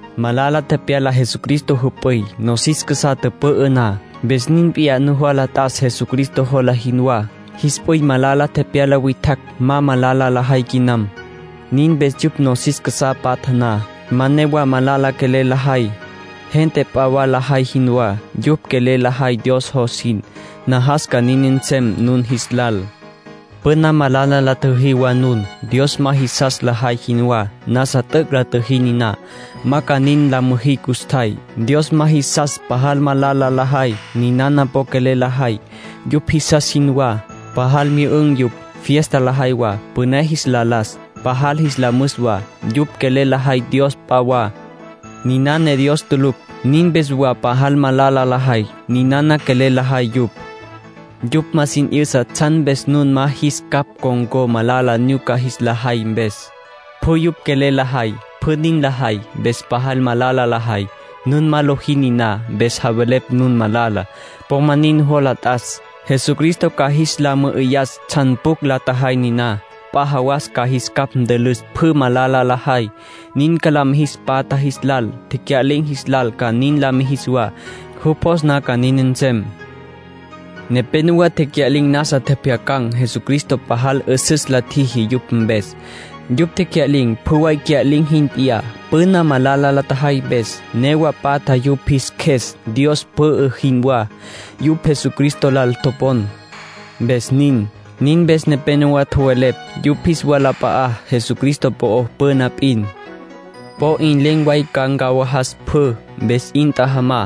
Malala tepyala Jesucristo jüp'üy, nosis casá tüpü'ü na. Mpes nin p'iyá nujola t'as Jesucristo jola jinwá. Jis p'üy malala tepyala witjacj ma malala lajay quinam. Nin mpes yupj nosis casá patja na, ma newa malala quelel lajay, gente p'a wa lajay jinwá. Yupj quelel lajay Dios jos jin. Najas ca nin nsem nun jis lal. Püna malala la tjüjí wa nun, Dios ma jisas lajay jinwá. Nasa t'üc' la tjüjí niná; ma ca nin la müjí custjay. Dios ma jisas pajal malala lajay. Ninana po quelel lajay, yupj jisas jinwá. Pajal myü'ün̈ yupj. Fiesta lajay wa, püné jis la las, pajal jis la müs wa. Yupj quelel lajay dios p'a wa, niná ne Dios tulucj. Nin mpes wa pajal malala lajay. Ninana quelel lajay yupj. Yupj ma sin 'yüsa tsjan mpes nun ma jis capj con̈có malala nyuca jis la jay mpes. Pjü yupj quelel lajay, pjü nin lajay, mpes pajal malala lajay. Nun ma lojí niná, mpes javelepj nun malala. Po ma nin nujola t'as. Jesucristo ca jis la mü'üyas tsjan pjucj la tjajay niná. P'a jawas ca jis capj ntülüs pjü malala lajay. Nin ca la mijis patja jis lal. Tecya'lin̈ jis lal ca nin la mijis wa. Jupj jos na ca nin nsem. Nepénowa tecya'lin̈ nasa tjepjyacan̈ Jesucristo pajal 'üsüs la tjiji yupj mpes. Yupj tecya'lin̈ pjü way cya'lin̈ jin p'iyá, püna malala la tjajay mpes. Newa patja yupj jis qjues, Dios pü'ü jinwá. Yupj Jesucristo lal topon, mpes nin. Nin mpes nepénowa tjowelepj yupj jis walap'a'á Jesucristo po'ó püna p'in. Po 'in len̈ way ca ncawajas pjü. Mpes 'in tjajamá,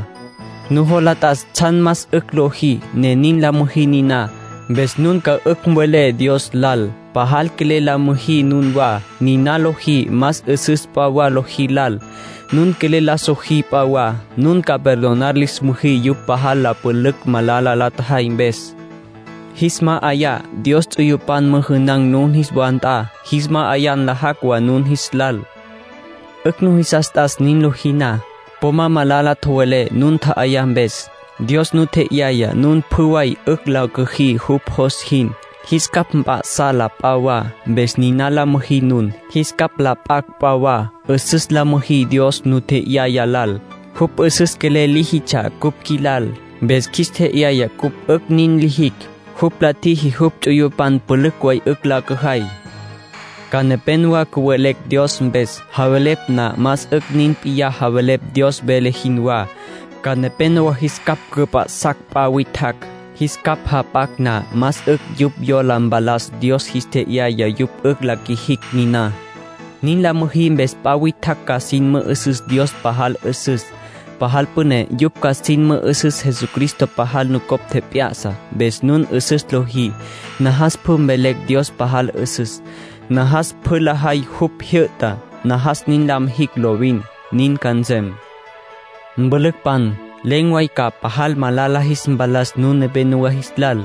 nujola t'as tsjan más 'ücj lojí, ne nin la müjí niná. Mpes nun ca 'ücj mvelé Dios lal. Pajal quelel la müjí nunwá. Niná lojí más 'üsüs p'a wa lojí lal. Nun quelel la sojí p'a wa, nun ca perdonar lis müjí yupj pajal la pülücj malala la tjajay mpes. Jis ma'ayá Dios ts'uyupan müjünan̈ nun jis wa nt'a, jis ma'ayá nlajacj wa nun jis lal. 'Ücj nujisas t'as nin lojí na. Po ma malala tjowelé nun tja'ayá mpes. Dios nu tje'yaya nun pjü way 'ücj la cüjí jupj jos jin, jis capj mp'a'sá la p'a wa. Mpes niná la müjí nun, jis capj la p'acj p'a wa. 'Üsüs la müjí Dios nu tje'yaya lal. Jupj 'üsüs quelel líjitsja cupj qjuilal, mpes qjuis tje'yaya cupj 'ücj nin lijicj. Jupj la tjiji jupj ts'uyupan pülücj way 'ücj la cüjay. Ca nepénowa cüwelecj Dios mpes. Javelepj na, más 'ücj nin p'iyá javelepj Dios vele jinwá. Ca nepénowa jis capj cüp'a'sacj p'a witjacj. Jis capj jap'acj na, más 'ücj yupj yola mpalas Dios jis tje'yaya yupj 'ücj la qjuijicj niná. Nin la müjí mpes p'a witjacj ca sin mü'üsüs Dios pajal 'üsüs, pajal püné. Yupj ca sin mü'üsüs Jesucristo pajal nucopj tjep'ya'sa, mpes nun 'üsüs lojí. Najas pjü mvelecj Dios pajal 'üsüs. Najas pjü lajay jupj jyü'tá. Najas nin la mijicj lovin. Nin ca nsem. Mpülücpan, len̈ way ca pajal malala jis mpalas nun nepénowa jis lal.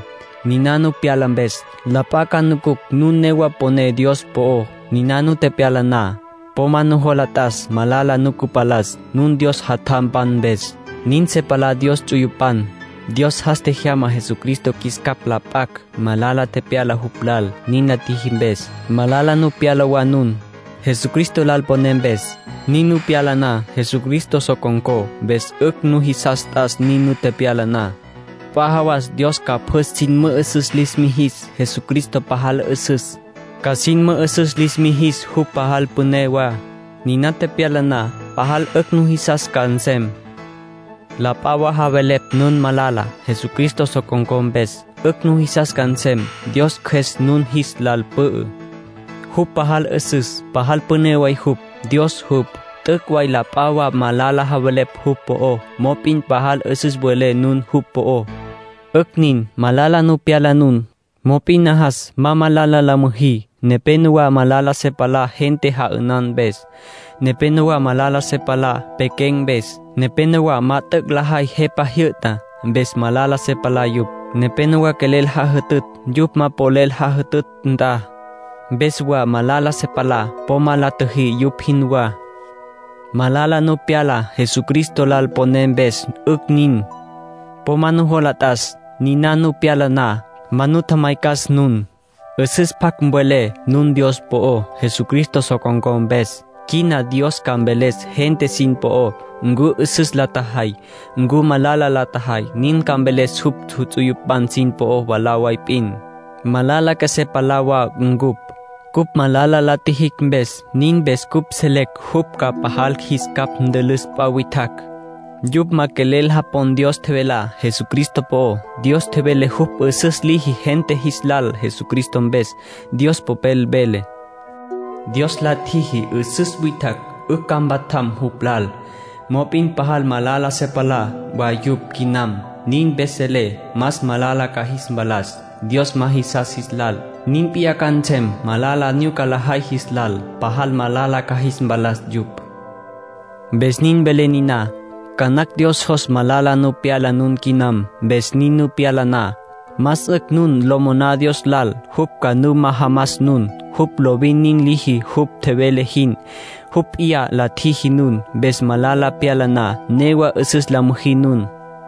Niná nu pyala mpes, la p'a ca nucucj nun newa poné Dios po'ó. Niná nu tepyala na, po ma nujola t'as ma malala nu cüpalas, nun Dios jatjampan mpes. Nin se palá Dios ts'uyupan. Dios jas tjejyama Jesucristo qjuis capj la p'acj. Malala tepyala jupj lal, nin la tjiji mpes. Malala nu pyala wa nun, Jesucristo lal poné mpes. Nin nu pyala na, Jesucristo so con̈có. Mpes 'ücj nujisas t'as nin nu tepyala na. P'a jawas Dios ca pjü sin mü'üsüs lis mijis Jesucristo pajal 'üsüs, ca sin mü'üsüs lis mijis jupj pajal püné wa. Niná tepyala na, pajal 'ücj nujisas ca nsem. La p'a wa javelepj nun malala, Jesucristo so con̈có mpes. 'Ücj nujisas ca nsem. Dios Cjües nun jis lal pü'ü. Jupj pajal 'üsüs, pajal püné way jupj. Dios jupj. T'üc' way la p'a wa malala javelepj jupj po'ó; mop'in pajal 'üsüs welé nun jupj po'ó. 'Ücj nin, malala nu pyala nun. Mop'in najas ma malala la müjí. Nepénowa malala se palá gente ja'ünan mpes. Nepénowa malala se palá pequen̈ mpes. Nepénowa ma t'üc' lajay jepa jyü'tá, mpes malala se palá yupj. Nepénowa quelel jajütütj yupj ma polel jajütütj nt'a, mpes wa malala se palá. Po ma la tjüjí yupj jinwá. Malala nu pyala Jesucristo lal poné mpes, 'ücj nin. Po ma nujola t'as. Niná nu pyala na, ma nu tjamaycas nun. 'Üsüs pjac mvelé nun Dios po'ó, Jesucristo so con̈có mpes. Quina Dios ca mveles gente sin po'ó, ncu 'üsüs la tjajay, ncu malala la tjajay. Nin ca mveles jupj ts'uyupan sin po'ó mwalá way p'in. Malala qjuesé palá wa ncupj, cupj malala la tjijicj mpes. Nin mpes cupj selecj jupj ca pajal jis capj ntülüs p'a witjacj. Yupj ma quelel japon Dios tjevelá Jesucristo po'ó. Dios tjevele jupj 'üsüs liji gente jis lal Jesucristo mpes. Dios Popel vele: “Dios la tjiji 'üsüs witjacj 'ücj ca mpatjam jupj lal. Mop'in pajal malala se palá wa yupj quinam. Nin mpes selecj más malala ca jis mpalas Dios ma jisas jis lal, nin p'iyá ca nsem malala nyuca lajay jis lal. Pajal malala ca jis mpalas yupj.” Mpes nin velé niná. Ca nacj Dios jos malala nu pyala nun quinam. Mpes nin nu pyala na, más 'ücj nun lo moná Dios lal jupj ca nu majamas nun. Jupj lovin nin liji jupj tjevele jin. Jupj p'iyá la tjiji nun. Mpes malala pyala na, newa 'üsüs la müjí nun.